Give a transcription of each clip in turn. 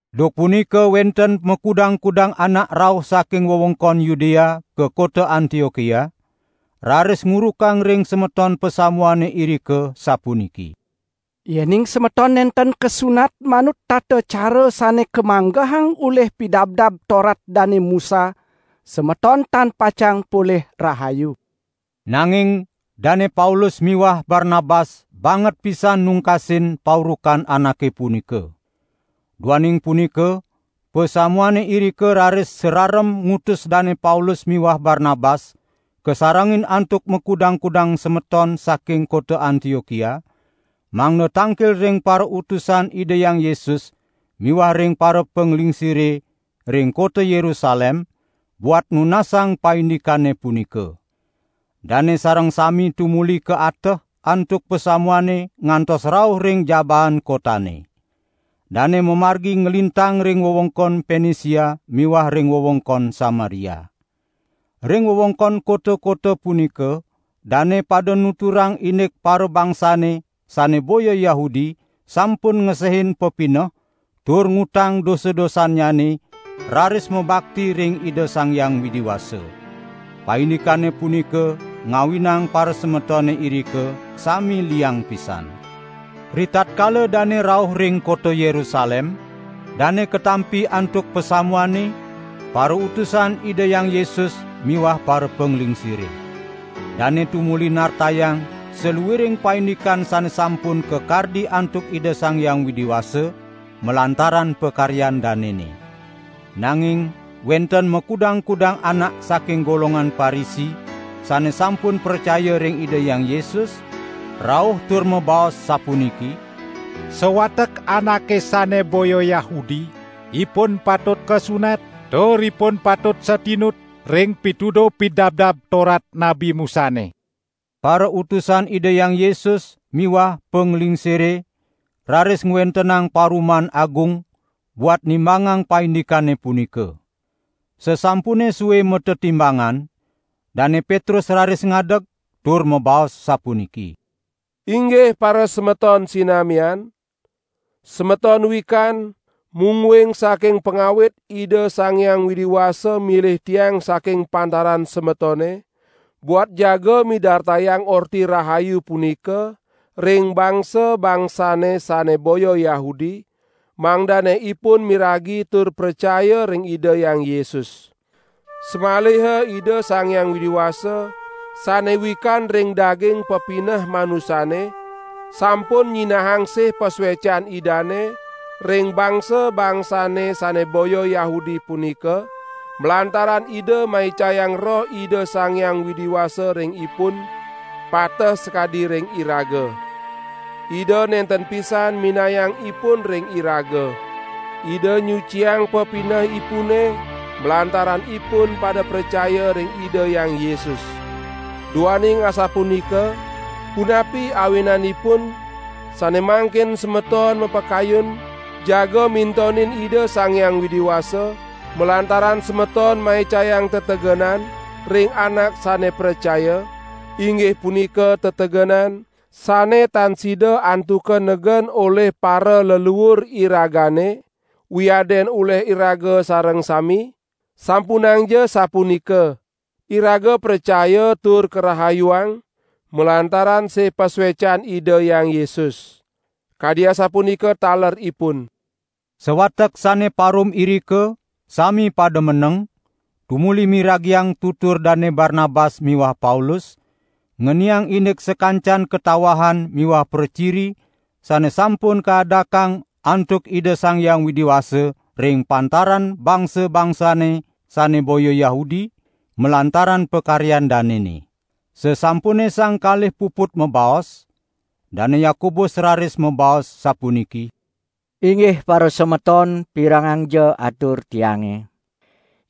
Duk punika wenten makudang-kudang anak rauh saking wewengkon Yudea ka kota Antiokia, raris ngurukang ring semeton pasamuane irika, sapuniki: "Yening semeton nenten kasunat manut tata cara sane kamanggehang olih Pidabdab Torat Dane Musa, semeton tan pacang polih rahayu." Nanging Dane Paulus miwah Barnabas banget pisan nungkasin paurukan anake punika. Duaning punika pasamuane irika raris sararem ngutus Dane Paulus miwah Barnabas kasarengin antuk makudang-kudang semeton saking kota Antiokia, mangda tangkil ring parautusan Ida Hyang Yesus miwah ring parapanglingsire ring kota Yerusalem buat nunasang paindikane punika. Dane sareng sami tumuli kaateh antuk pasamuane ngantos rauh ring jabaan kotane. Dane mamargi nglintang ring wewengkon Penisia miwah ring wewengkon Samaria. Ring wewengkon kota-kota punika dane pada nuturang indik parabangsane sane boya Yahudi sampun ngesehin pepineh tur ngutang dosa-dosannyane raris mabakti ring Ida Sang Hyang Widi Wasa. Paindikane punika ngawinang parasemetone irika sami liang pisan. Ritatkala dane rauh ring kota Yerusalem, dane katampi antuk pasamuane, parautusan Ida Hyang Yesus miwah parapanglingsire. Dane tumuli nartayang saluiring paindikan sane sampun kakardi antuk Ida Sang Hyang Widi Wasa malantaran pakaryan danene. Nanging wenten makudang-kudang anak saking golongan Parisi sane sampun pracaya ring Ida Hyang Yesus, rauh tur mabaos sapuniki: "Sawatek anake sane boya Yahudi, ipun patut kasunat, tur ipun patut satinut ring pituduh Pidabdab Torat Nabi Musane." Parautusan Ida Hyang Yesus miwah panglingsire raris ngwentenang paruman agung buat nimbangang paindikane punika. Sasampune sue matetimbangan, Dane Petrus raris ngadeg tur mabaos sapuniki: "Inggih parasemeton sinamian. Semeton wikan mungguing saking pangawit Ida Sang Hyang Widi Wasa milih tiang saking pantaran semetone, buat jaga midartayang Orti Rahayu punika ring bangsa-bangsane sane boya Yahudi, mangdane ipun miragi tur pracaya ring Ida Hyang Yesus. Samaliha Ida Sang Hyang Widi Wasa sane wikan ring daging pepineh manusane, sampun nyinahang sih pasuecan Idane ring bangsa-bangsane sane boya Yahudi punika, malantaran Ida maicayang Roh Ida Sang Hyang Widi Wasa ring ipun, pateh sakadi ring iraga. Ida nenten pisan minayang ipun ring iraga. Ida nyuciang pepinehipune, malantaran ipun pada pracaya ring Ida Hyang Yesus. Duaning asapunika, punapi awinanipun sane mangkin semeton mapakayun jaga mintonin Ida Sang Hyang Widi Wasa, malantaran semeton maicayang tetegenan ring anak sane pracaya, inggih punika tetegenan sane tan sida antuka negen olih paraleluur iragane, wiadin olih iraga sareng sami? Sampunangja sapunika! Iraga pracaya tur karahayuang malantaran sih pasuecan Ida Hyang Yesus. Kadi asapunika taler ipun." Sawatek sane parum irika sami pada meneng, tumuli miragiang tutur Dane Barnabas miwah Paulus, ngeniang indik sakancan katawahan miwah praciri sane sampun kaadakang antuk Ida Sang Hyang Widi Wasa ring pantaran bangsa-bangsane sane boya Yahudi, malantaran pakaryan danene. Sasampune sang kalih puput mabaos, Dane Yakobus raris mabaos sapuniki: "Inggih parasemeton pirengangja atur tiange!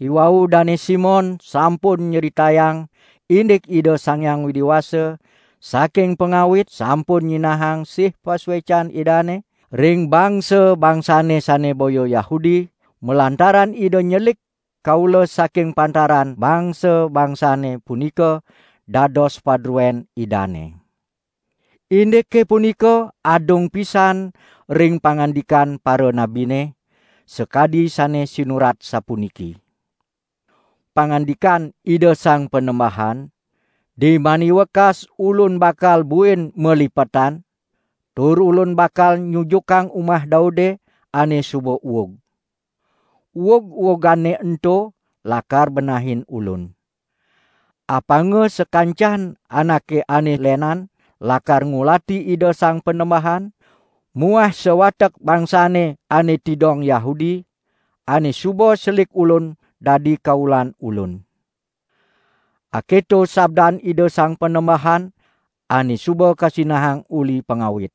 Iwau Dane Simon sampun nyritayang indik Ida Sang Hyang Widi Wasa saking pangawit sampun nyinahang sih pasuecan Idane ring bangsa-bangsane sane boya Yahudi, malantaran Ida nyelik kaula saking pantaran bangsa-bangsane punika dados padruen Idane. Indike punika adung pisan ring pangandikan paranabine, sakadi sane sinurat sapuniki: 'Pangandikan Ida Sang Panembahan: Dimani wekas Ulun bakal buin malipetan, tur Ulun bakal nyujukang umah Daude ane suba uug. Uug-uugane ento lakar benahin Ulun. Apanga sakancan anake ane lenan lakar ngulati Ida Sang Panembahan muah sawatek bangsane ane tidong Yahudi, ane suba selik Ulun dadi kaulan Ulun. Aketo sabdan Ida Sang Panembahan, ane suba kasinahang uli pangawit.' "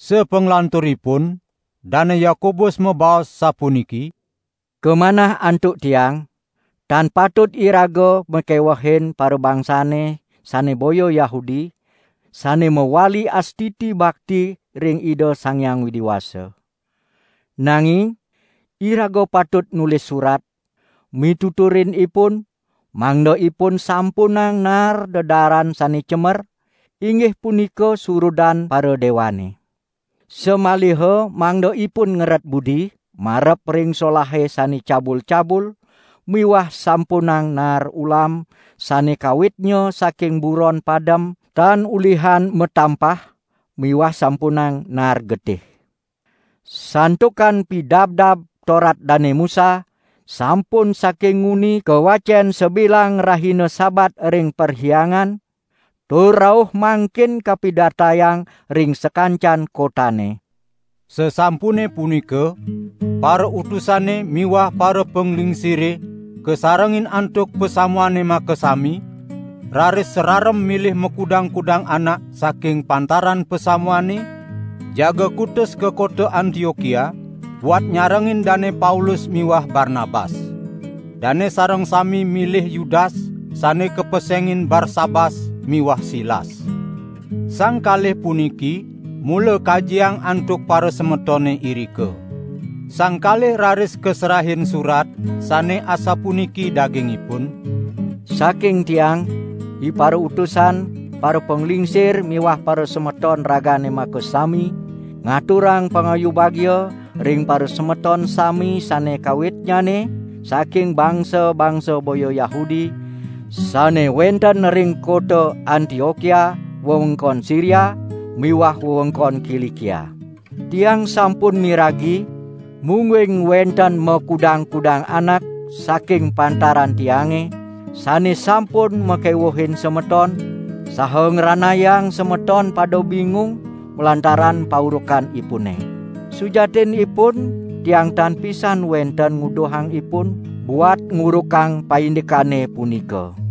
Sapanglanturipun Dane Yakobus mabaos sapuniki: "Kamanah antuk tiang, tan patut iraga makewehin parabangsane sane boya Yahudi sane mawali astiti bakti ring Ida Sang Hyang Widi Wasa. Nanging, iraga patut nulis surat, mituturin ipun, mangda ipun sampunang naar dedaaran sane cemer, inggih punika surudan paradewane. Samaliha mangda ipun ngeret budi marep ring solahe sane cabul-cabul miwah sampunang naar ulam sane kawitnya saking buron padem tan ulihan matampah miwah sampunang naar getih. Santukan Pidabdab Torat Dane Musa sampun saking nguni kawacen sabilang rahina Sabat ring perhyangan, tur rauh mangkin kapidartayang ring sakancan kotane." Sasampune punika parautusane miwah parapanglingsire kasarengin antuk pasamuane makasami, raris sararem milih makudang-kudang anak saking pantaran pasamuane, jaga kutus ka kota Antiokia buat nyarengin Dane Paulus miwah Barnabas. Dane sareng sami milih Yudas, sane kapesengin Barsabas miwah Silas. Sang kalih puniki mula kajiang antuk parasemetone irika. Sang kalih raris kaserahin surat sane asapuniki daging ipun: "Saking tiang, iparautusan, parapanglingsir miwah parasemeton ragane makasami ngaturang pangayu bagia ring parasemeton sami sane kawitnyane saking bangsa-bangsa boya Yahudi, sane wenten ring kota Antiokia wewengkon Siria miwah wewengkon Kilikia. Tiang sampun miragi, mungguing wenten makudang-kudang anak saking pantaran tiange, sane sampun makewuhin semeton, saha ngranayang semeton pada bingung malantaran paurukanipune. Sujatinipun tiang tan pisan wenten nguduhang ipun buat ngurukang paindikane punika.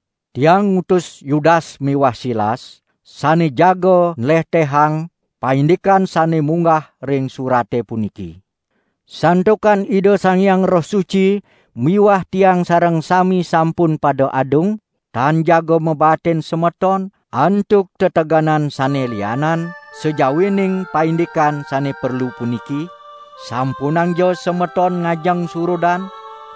Tiang ngutus Yudas miwah Silas, sane jaga nlehtehang, paindikan sane munggah ring surate puniki. Santukan Ida Sang Hyang Roh Suci miwah tiang sareng sami sampun pada adung, tan jaga mabaatin semeton antuk tetegenan sane lianan, sajawining paindikan sane perlu puniki: sampunangja semeton ngajeng surudan,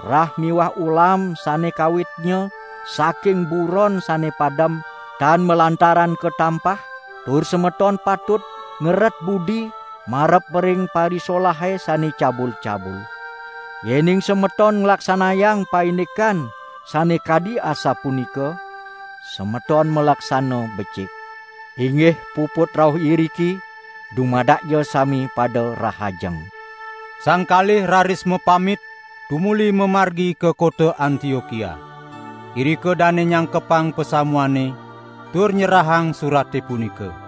rah miwah ulam sane kawitnya saking buron sane padem tan malantaran katampah; tur semeton patut ngeret budi marep ring parisolahe sane cabul-cabul. Yening semeton nglaksanayang paindikan sane kadi asapunika, semeton malaksana becik. Inggih puput rauh iriki, dumadakja sami pada rahajeng." Sang kalih raris mapamit, tumuli mamargi ka kota Antiokia. Irika dane nyangkepang pasamuane, tur nyerahang surate punika.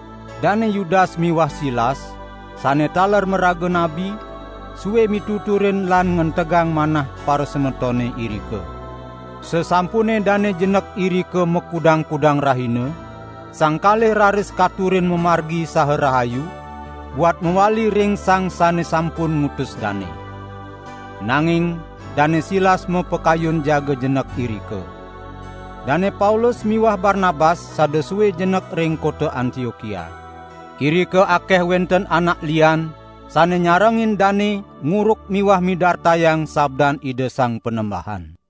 Dane Yudas miwah Silas, sane taler maraga nabi, sue mituturin lan ngentegang manah parasemetone irika. Sasampune dane jenek irika makudang-kudang rahina, sang kalih raris katurin mamargi saha rahayu, buat mawali ring sang sane sampun ngutus dane. [ Nanging Dane Silas mapakayun jaga jenek irika.] Dane Paulus miwah Barnabas sada sue jenek ring kota Antiokia. Irika akeh wenten anak lian sane nyarengin dane nguruk miwah midartayang sabdan Ida Sang Panembahan.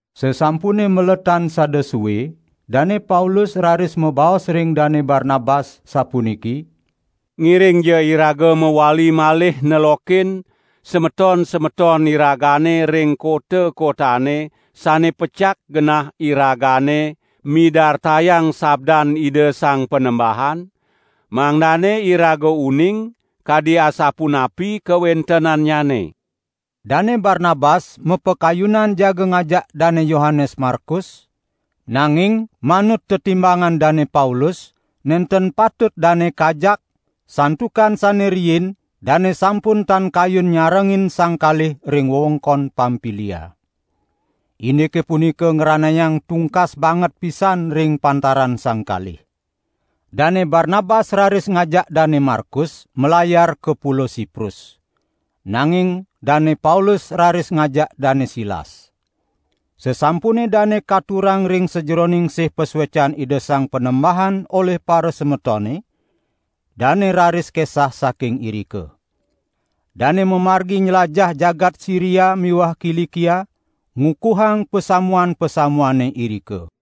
Sasampune maletan sada sue, Dane Paulus raris mabaos ring Dane Barnabas, sapuniki: "Ngiringja iraga mawali malih nelokin semeton-semeton iragane ring kota-kotane sane pecak genah iragane midartayang sabdan Ida Sang Panembahan, mangdane iraga uning kadi asapunapi kawentenannyane." Dane Barnabas mapakayunan jaga ngajak Dane Yohanes Markus, nanging manut tetimbangan Dane Paulus nenten patut dane kajak, santukan sane riin dane sampun tan kayun nyarengin sang kalih ring wewengkon Pampilia. Indike punika ngranayang tungkas banget pisan ring pantaran sang kalih. Dane Barnabas raris ngajak Dane Markus, malayar ka Pulo Siprus. Nanging Dane Paulus raris ngajak Dane Silas. Sasampune dane katurang ring sajeroning sih pasuecan Ida Sang Panembahan olih parasemetone, dane raris kesah saking irika. Dane mamargi nylajah jagat Siria miwah Kilikia, ngukuhang pasamuan-pasamuane irika.